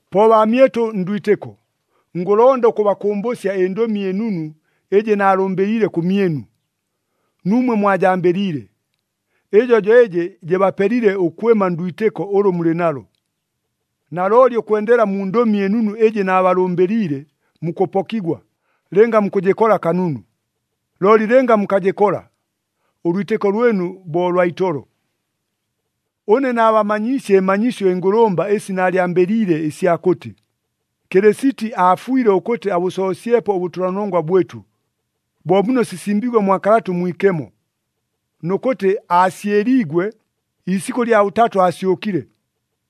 Po baamyɨtʉ ndwitɨko, ngʉlonda ʉkʉbakʉmbʉsya ɨNdʉmi ɨNunu ɨjɨ naalʉmbɨliile kʉmyɨnu, nuumwe mwajambɨliile. Ɨjo jo ɨjɨ jɨbapelile ʉkwɨma ndwitɨko ʉlʉ mulɨ nalo. Nalooli ʉkwendela mu Ndʉmi ɨNunu ɨjɨ naabalʉmbɨliile, mukʉpokigwa, lɨnga mukʉjɨkola kanunu. Looli lɨnga mukajɨkola, ʉlwitɨko lwɨnu bo lwa itolo. Ʉne naabamanyiisye ɨmanyisyo ɨngʉlʉmba ɨsi naalyambɨliile ɨsya kʉtɨ, Kɨlɨsiti aafwile ʉkʉtɨ abʉsoosyepo ʉbʉtʉlanongwa bwɨtʉ, bo muno sisimbiigwe mwa Kalata ʉMwikemo. Nʉ kʉtɨ aasyɨliigwe, iisikʉ lya bʉtatʉ aasyʉkile,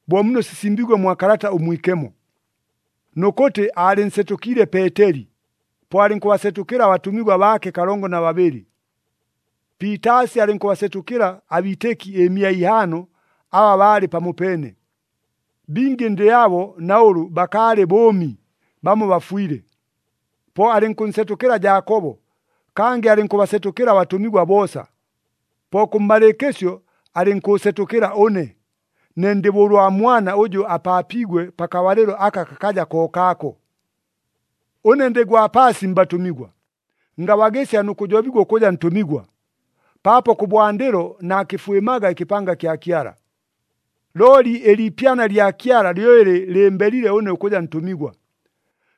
bo muno sisimbiigwe mwa Kalata ʉMwikemo. Nʉ kʉtɨ aalɨnsetʉkiile Peeteli, po alɨnkʉbasetʉkɨla abatʉmigwa baake kalongo na babɨlɨ. Piitaasi alɨnkʉbasetʉkɨla abiitɨki ɨmia ihaano aba baalɨ pamopeene. Bingi ndɨ abo na ʉlʉ bakaalɨ bʉʉmi, bamo bafwile. Po alɨnkʉnsetʉkɨla Jaakobo, kangɨ alɨnkʉbasetʉkɨla abatʉmigwa boosa. Po kʉmmalɨɨkɨsyo alɨnkʉʉsetʉkɨla ʉne, ne ndɨ bo ʉlwa mwana ʉjʉ apaapiigwe pakabalɨlo aka kakaja kookaako. Ʉne ndɨ gwa paasi mbatʉmigwa, ngabagɨsya nʉ kʉjobigwa ʉkʉja ntʉmigwa, paapo kʉbwandɨlo naakɨfwɨmaga ɨkɨpanga kya Kyala. Looli ɨliipyana lya Kyala lyo ɨlɨ lɨmbelile ʉne ʉkʉja ntʉmigwa.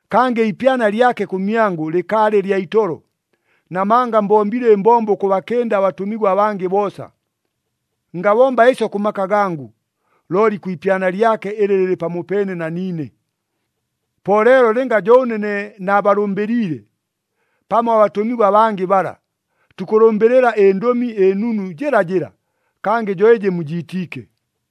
Kangɨ iipyana lyake kʉmyangʉ lɨkaalɨ lya itolo, namanga mbombile ɨmbombo ʉkʉbakɨnda abatʉmigwa abangɨ boosa. Ngabomba ɨsyo kʉ maka gangʉ, looli kwi ipyana lyake ɨlɨ lɨlɨ pamopeene na niine. Po leelo lɨnga jo ʉne ne naabalʉmbɨliile, pamo abatʉmigwa abangɨ bala, tukʉlʉmbɨlɨla ɨNdʉmi ɨNunu jɨlajɨla, kangɨ jo ɨjɨ mujiitiike.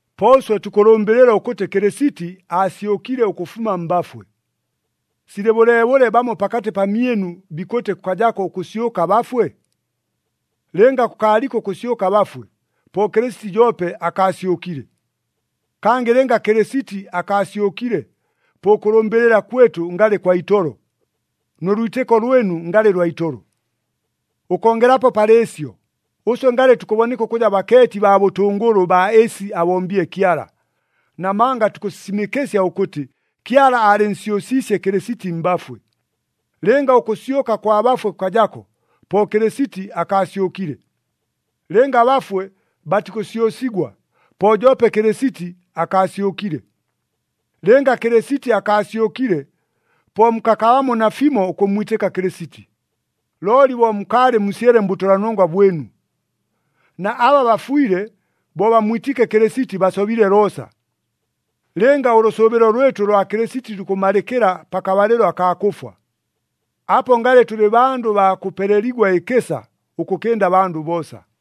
Po ʉswe tukʉlʉmbɨlɨla ʉkʉtɨ Kɨlɨsiti aasyʉkile ʉkʉfuma mbafwe. Silɨ bʉleebʉle bamo pakatɨ pamyɨnu bikʉtɨ kʉkajako ʉkʉsyʉka abafwe? Lɨnga kʉkaaliko ʉkʉsyʉka abafwe, po Kɨlɨsiti joope akaasyʉkile. Kangɨ lɨnga Kɨlɨsiti akaasyʉkile, po ʉkʉlʉmbɨlɨla kwɨtʉ ngalɨ kwa itolo, nʉ lwitɨko lwɨnu ngalɨ lwa itolo. Ʉkongelapo palɨ ɨsyo, ʉswe ngalɨ tukʉboneka ʉkʉja bakeeti baa bʉtʉngʉlʉ baa ɨsi abombile Kyala, namanga tukʉsisimɨkɨsya ʉkʉtɨ Kyala aalɨnsyʉsiisye Kɨlɨsiti mbafwe. Lɨnga ʉkʉsyʉka kwa bafwe kʉkajako, po Kɨlɨsiti akaasyʉkile. Lɨnga abafwe batikʉsyʉsigwa, po joope Kɨlɨsiti akaasyʉkile. Lɨnga Kɨlɨsiti akaasyʉkile, po mukakabamo nafimo ʉkʉmmwitɨka Kɨlɨsiti, looli bo mukaalɨ musyele mbʉtʉlanongwa bwɨnu. Na aba bafwile bo bammwitiike Kɨlɨsiti, basobile loosa. Lɨnga ʉlʉsʉʉbɨlo lwɨtʉ kwa Kɨlɨsiti lukʉmalɨkɨla pakabalɨlo akaa kʉfwa, apo ngalɨ tʉlɨ bandʉ baa kʉpeleligwa ɨkɨsa ʉkʉkɨnda abandʉ boosa.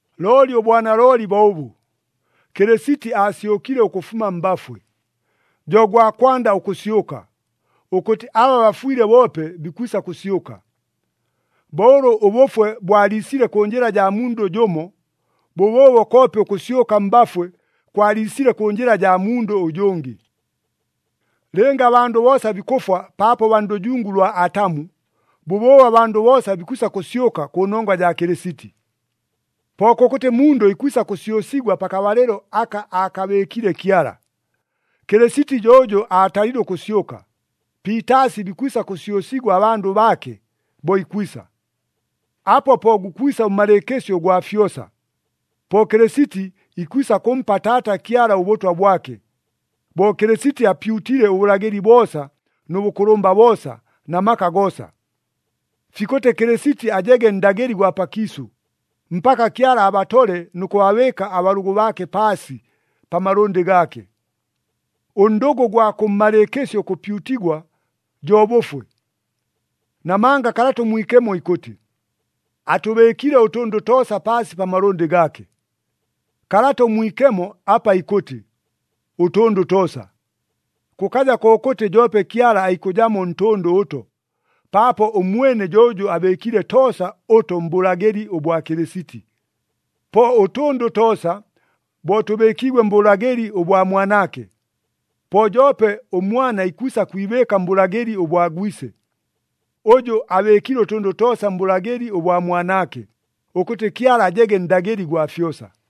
Looli ʉbwanalooli bo ʉbʉ, Kɨlɨsiti aasyʉkile ʉkʉfuma mbafwe, jo gwa kwanda ʉkʉsyʉka, ʉkʉtɨ aba bafwile boope bikwisa kʉsyʉka. Bo ʉlʉ ʉbʉfwe bwaliisile kʉ njɨla jaa mundʉ jʉmo, bʉbʉʉbo koope ʉkʉsyʉka mbafwe kwaliisile kʉ njɨla jaa mundʉ ʉjʉngɨ. Lɨnga abandʉ boosa bikʉfwa paapo baa ndʉjungu lwa Atamu, bʉbʉʉbo abandʉ boosa bikwisa kʉsyʉka kʉnongwa jaa Kɨlɨsiti. Po kʉkʉtɨ mundʉ ikwisa kʉsyʉsigwa pakabalɨlo aka aakabɨɨkile Kyala. Kɨlɨsiti jo ʉjʉ aatalile ʉkʉsyʉka, piitaasi bikwisa kʉsyʉsigwa abandʉ baake, bo ikwisa. Apo po gukwisa ʉmmalɨɨkɨsyo ʉgwa fyosa, po Kɨlɨsiti ikwisa kʉmpa Taata Kyala ʉbʉtwa bwake, bo Kɨlɨsiti apyutile ʉbʉlagɨli boosa nʉ bʉkʉlʉmba boosa na maka goosa. Fikʉtɨ Kɨlɨsiti ajege Ndagɨli gwa pakiisʉ, mpaka Kyala abatole nʉ kʉbabɨɨka abalʉgʉ baake paasi, pa malʉndɨ gaake. Ʉndʉgʉ ʉgwa kʉmmalɨɨkɨsyo ʉkʉpyutigwa, jo bʉfwe. Namanga Kalata ʉMwikemo ikʉtɨ, “Atʉbɨɨkile ʉtʉndʉ toosa paasi pa malʉndɨ gaake.” Kalata ʉMwikemo apa ikʉtɨ, “Ʉtʉndʉ toosa,” kʉkaja kokʉtɨ joope Kyala aikʉjamo ntʉndʉ ʉto, paapo ʉmwene jo ʉjʉ abɨɨkile toosa ʉto mbʉlagɨli ʉbwa Kɨlɨsiti. Po ʉtʉndʉ toosa bo tʉbɨɨkiigwe mbʉlagɨli ʉbwa Mwanaake, po joope ʉMwana ikwisa kwibɨɨka mbʉlagɨli ʉbwa Gwise, ʉjʉ abɨɨkile ʉtʉndʉ toosa mbʉlagɨli ʉbwa Mwanaake, ʉkʉtɨ Kyala ajege Ndagɨli gwa fyosa.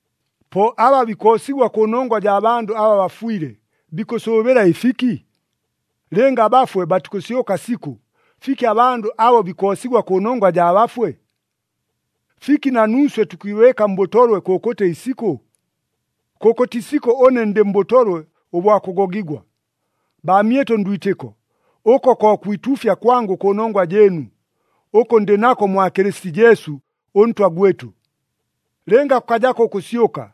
Po aba bikoosigwa kʉnongwa jaa bandʉ aba bafwile bikʉsʉʉbɨla ɨfiki? Lɨnga abafwe batikʉsyʉka sikʉ, fiki abandʉ abo bikoosigwa kʉnongwa jaa bafwe? Fiki na nuuswe tukwibɨɨka mbʉtolwe kʉkʉtɨ isikʉ? Kʉkʉtɨ isikʉ ʉne ndɨ mbʉtolwe ʉbwa kʉgogigwa. Baamyɨtʉ ndwitɨko, ʉko ko kwituufya kwangʉ kʉnongwa jɨɨnu, ʉkʉ ndɨ nako mwa Kɨlɨsiti Jesu ʉNtwa gwɨtʉ. Lɨnga kʉkajako ʉkʉsyʉka,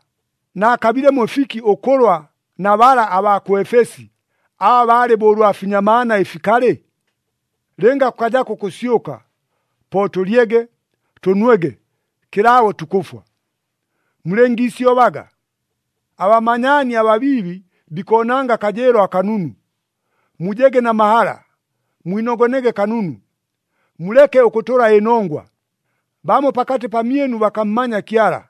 naakabilemo ɨfiki ʉkʉlwa na bala abaa kʉ Efesi, aba balɨ bo ʉlwa finyamaana ɨfikalɨ? Lɨnga kʉkajako ʉkʉsyʉka, po, “Tʉlyege, tʉnwege, kɨlaabo tukʉfwa.” Mulɨngiisyobaga! “Abamanyaani ababiibi, bikoonanga akajɨɨlo akanunu.” Mujege na mahala, mwinogonege kanunu! Muleke ʉkʉtʉla ɨnongwa! Bamo pakatɨ pamyɨnu bakammanya Kyala.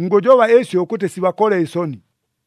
Ngʉjoba ɨsyo ʉkʉtɨ sibakole ɨsoni.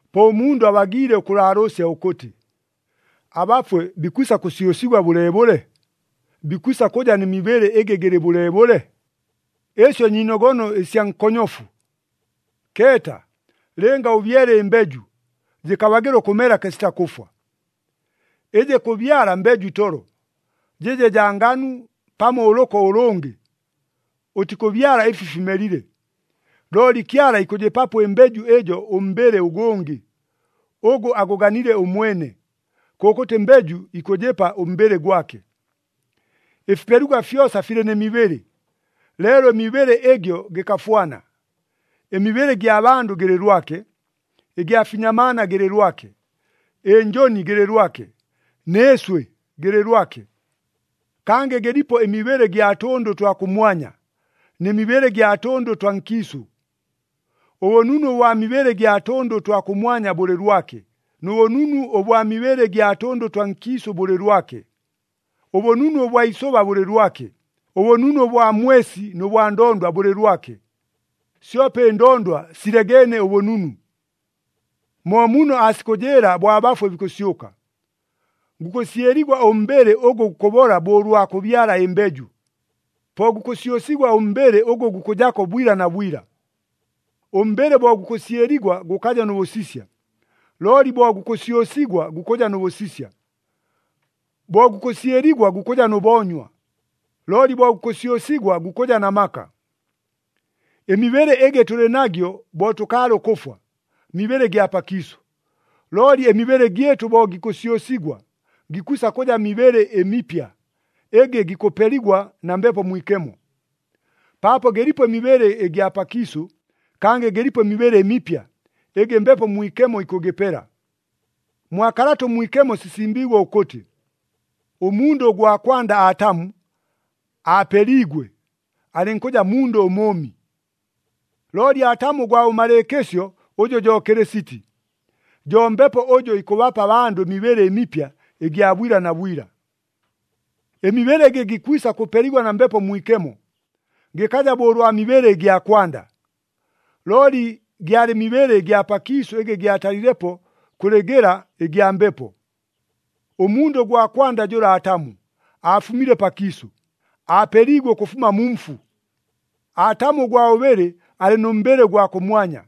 Po ʉmundʉ abagiile ʉkʉlaalʉʉsya ʉkʉtɨ, “Abafwe bikwisa kʉsyʉsigwa bʉleebʉle? Bikwisa kʉja nɨ mibɨlɨ ɨgɨ gɨlɨ bʉleebʉle?” Ɨsyo nyiinogono ɨsya nkonyofu! Keeta, lɨnga ʉbyele ɨmbeju, jɨkabagɨla ʉkʉmela kɨsita kʉfwa. Ɨjɨ kʉbyala mbeju itolo, jɨje jaa nganu pamo ʉlʉko ʉlʉngɨ, ʉtikʉbyala ɨfi fimelile. Looli Kyala ikʉjɨpapo ɨmbeju ɨjo ʉmbɨlɨ ʉgʉngɨ, ʉgʉ agʉganile ʉmwene. Kʉkʉtɨ mbeju ikʉjɨpa ʉmbɨlɨ gwake. Ɨfipeligwa fyosa filɨ nɨ mibɨlɨ, leelo ɨmibɨlɨ ɨgyo gɨkafwana. Ɨmibɨlɨ ɨgya bandʉ gɨlɨ lwake, ɨgya finyamaana gɨlɨ lwake, ɨnjʉni gɨlɨ lwake, nɨ ɨswɨ gɨlɨ lwake. Kangɨ gɨlipo ɨmibɨlɨ gya tʉndʉ ʉtwa kʉmwanya, nɨ mibɨlɨ gya tʉndʉ twa nkiisʉ. Ʉbʉnunu ʉbwa mibɨlɨ gya tʉndʉ ʉtwa kʉmwanya bʉlɨ lwake, nʉ bʉnunu ʉbwa mibɨlɨ gya tʉndʉ twa nkiisʉ bʉlɨ lwake. Ʉbʉnunu ʉbwa isʉba bʉlɨ lwake, ʉbʉnunu ʉbwa mwesi nʉ bwa ndondwa bʉlɨ lwake. Syope ɨndondwa silegeene ʉbʉnunu. Mo muno aasikʉjɨɨla bo abafwe bikʉsyʉka. Gukʉsyɨligwa ʉmbɨlɨ ʉgʉ gukʉbola bo ʉlwa kʉbyala ɨmbeju, po gukʉsyʉsigwa ʉmbɨlɨ ʉgʉ gukʉjako bwila na bwila. Ʉmbɨlɨ bo gukʉsyɨligwa gʉkaja nʉ bʉsisya, looli bo gukʉsyʉsigwa gukʉja nʉ bʉsisya. Bo gukʉsyɨligwa gukʉja nʉ boonywa, looli bo gukʉsyʉsigwa gukʉja na maka. Ɨmibɨlɨ ɨgɨ tʉlɨ nagyo bo tʉkaalɨ ʉkʉfwa, mibɨlɨ gya pakiisʉ, looli ɨmibɨlɨ gyɨtʉ bo gikʉsyʉsigwa, gikwisa kʉja mibɨlɨ ɨmipya ɨgɨ gikʉpeligwa na Mbepo Mwikemo. Paapo gɨlipo ɨmibɨlɨ ɨgya pakiisʉ, kangɨ gɨlipo ɨmibɨlɨ ɨmipya, ɨgɨ Mbepo Mwikemo ikʉgɨpela. Mwa Kalata ʉMwikemo sisimbiigwe ʉkʉtɨ, “Ʉmundʉ ʉgwa kwanda Atamu, aapeliigwe, alɨnkʉja mundʉ ʉmʉʉmi.” Looli Atamu ʉgwa bʉmalɨɨkɨsyo ʉjʉ jo Kɨlɨsiti, jo Mbepo ʉjʉ ikʉbapa abandʉ ɨmibɨlɨ ɨmipya ɨgya bwila na bwila. Ɨmibɨlɨ ɨgɨ gikwisa kʉpeligwa na Mbepo Mwikemo, gɨkaja bo ʉlwa mibɨlɨ ɨgya kwanda. Looli gyalɨ mibɨlɨ ɨgya pakiisʉ ɨgɨ gyatalilepo kʉlɨ gɨla ɨgya Mbepo. Ʉmundʉ ʉgwa kwanda jʉla Atamu aafumile pakiisʉ, aapeliigwe ʉkʉfuma mu mfu. Atamu ʉgwa bʉbɨlɨ alɨ nʉ mbɨlɨ ʉgwa kʉmwanya.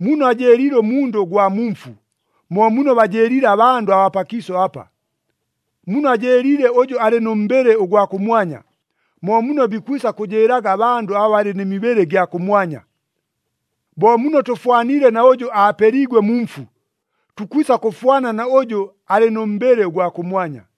Muno ajɨɨliile ʉmundʉ ʉgwa mu mfu, mo muno bajɨɨliile abandʉ abaa pakiisʉ apa. Muno ajɨɨliile ʉjʉ alɨ nʉ mbɨlɨ ʉgwa kʉmwanya, mo muno bikwisa kʉjɨɨlaga abandʉ aba balɨ nɨ mibɨlɨ ɨgya kʉmwanya. Bo muno tʉfwaniile na ʉjʉ aapeliigwe mu mfu, tukwisa kʉfwana na ʉjʉ alɨ nʉ mbɨlɨ ʉgwa kʉmwanya.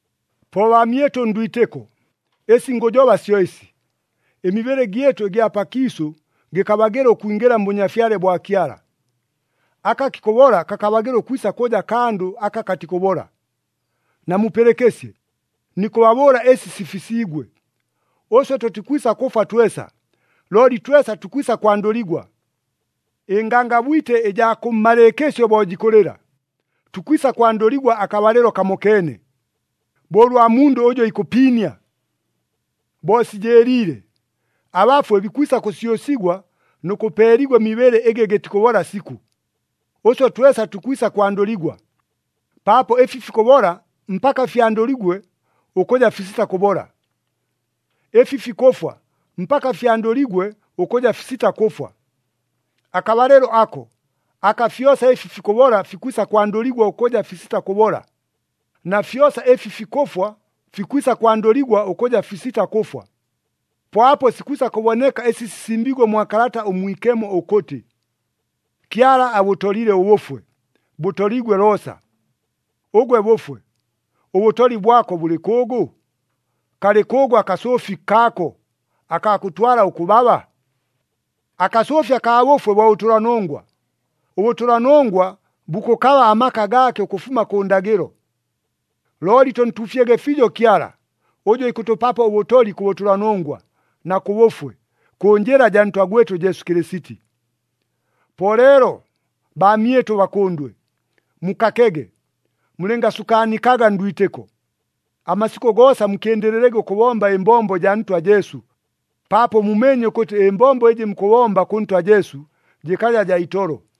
Po baamyɨtʉ ndwitɨko, ɨsi ngʉjoba syo ɨsi, ɨmibɨlɨ gyɨtʉ ɨgya pakiisʉ gɨkabagɨla ʉkwingɨla mBʉnyafyale bwa Kyala. Aka kikʉbola kakabagɨla ʉkwisa kʉja kandʉ aka katikʉbola. Namupɨlɨkɨsye, nikʉbabʉʉla ɨsi sifisiigwe. Ʉswe tʉtikwisa kʉfwa twesa, looli twesa tukwisa kwandʉligwa. Ɨngangabwite ɨjaa kʉmmalɨɨkɨsyo bo jikʉlɨla, tukwisa kwandʉligwa akabalɨlo kamokeene, bo ʉlwa mundʉ ʉjʉ ikʉpiinia. Bo sijɨɨliile, abafwe bikwisa kʉsyʉsigwa nʉ kʉpeeligwa ɨmibɨlɨ ɨgɨ gɨtikʉbola sikʉ. Ʉswe twesa tukwisa kwandʉligwa, paapo ɨfi fikʉbola mpaka fyandʉligwe ʉkʉja fisita kʉbola. Ɨfi fikʉfwa mpaka fyandʉligwe ʉkʉja fisita kʉfwa. Akabalɨlo ako, aka fyosa ɨfi fikʉbola fikwisa kwandʉligwa ʉkʉja fisita kʉbola, na fyosa ɨfi fikʉfwa fikwisa kwandʉligwa ʉkʉja fisita kʉfwa, po apo sikwisa kʉboneka ɨsi sisimbiigwe mwa Kalata ʉMwikemo ʉkʉtɨ, “Kyala abʉtolile ʉbʉfwe, bʉtoliigwe loosa!” “Ʉgwe bʉfwe, ʉbʉtoli bwako bʉlɨ kʉʉgʉ? Kalɨ kʉʉgʉ akasʉʉfi kaako, akaa kʉtwala ʉkʉbaba?” Akasʉʉfi akaa bʉfwe bo bʉtʉlanongwa, ʉbʉtʉlanongwa bukʉkaba amaka gaake ʉkʉfuma kʉ ndagɨlo. Looli tʉntuufyege fiijo Kyala, ʉjʉ ikʉtʉpapo ʉbʉtoli kʉ bʉtʉlanongwa, na kʉ bʉfwe, kʉ njɨla jaa Ntwa gwɨtʉ Jesu Kɨlɨsiti. Po leelo, baamyɨtʉ bakʉndwe, mukakege, mulɨngasukaanikaga ndwitɨko. Amasikʉ goosa mukɨndɨlɨlege ʉkʉbomba ɨmbombo jaa Ntwa Jesu, paapo mumeenye ʉkʉtɨ ɨmbombo ɨjɨ mukʉbomba kʉ Ntwa Jesu, jɨkaja jaa itolo.